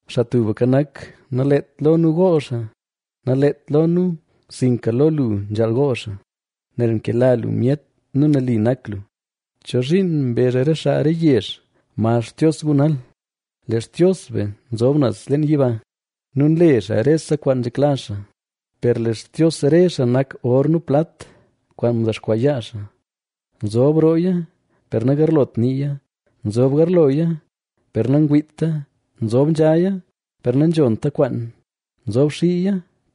Xaa Tubka Nak, naleet lo nu gool xaa, naleet lo nu sinka lo lu nzhaal gool xaa, nel nkela lu myet nu nali nak lu. ¿Chozhiin mbezh re xaa re yezh: “¿Ma Xtios gu nal?” Lee Xtios be nzob naz leen yiba nu nle xaa rese kwaan nzhekla xaa. Per lee xtios re xaa nak or nu plat, kwaan ndexkwaa yaa xaa. Nzob rooya, per nagarlot niiya; nzob garloya, per nangwiita, nzob nzhaya, per nanzhonta kwaan; nzob xiiya,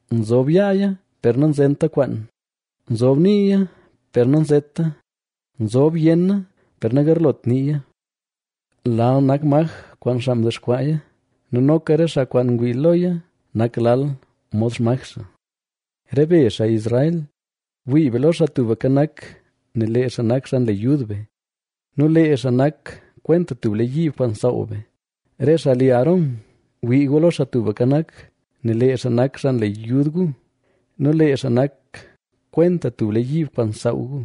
nzob yaaya, per nanzenta kwaan; nzob niiya, per nanzeta; nzob yenna, per nagarlot niiya. Lal nak maj kwaan xaa mdexkwaaya nu noka re xaa kwaan ngwii loya nak lal mod xmaj xaa. Re be, xaa Israel, wii be lo Xaa Tubka Nak; nel lee xaa nak xaa nle yud be, nu lee xaa nak kwenta tub lee yiib kwaan nsaaw be. Re xaa li Aarón, wii gu lo Xaa Tubka Nak; nel lee xaa nak xaa nle yud gu, nu lee xaa nak kwenta tub lee yiib kwaan nsaaw gu.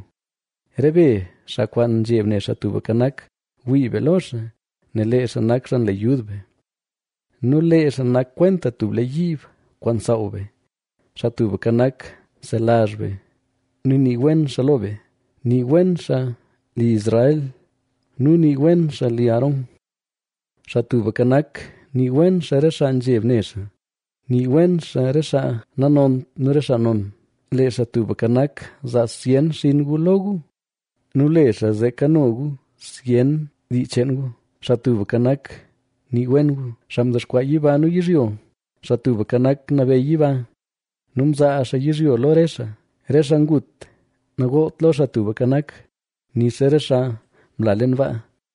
Re be xaa kwaan nzheb ne Xaa Tubka Nak, wii be lo xaa; nel lee xaa nak xaa nle yud be nu lee xaa nak kwenta tub lee yiib kwaan nsaaw be. Xaa Tubka Nak, nselazh be nu nii wen xaa lo be. Nii wen xaa li Israel nu nii wen xaa li Aarón. Xaa Tubka Nak nii wen xaa re xaa nzheb ne xaa, nii wen xaa re xaa nanont nu re xaa non. Lee Xaa Tubka Nak, zaa zyen xinn gu lo gu nu le xaa zee kano gu zyen dii cheen gu. Xaa Tubka Nak, nii wen gu, xaa mdexkwaa yiba nu yizhyo. Xaa Tubka Nak, nabeyy yiba, nu mzaa xaa yizhyo lo re xaa. Re xaa ngut nagoolt lo Xaa Tubka Nak nixa re xaa mla leen baa.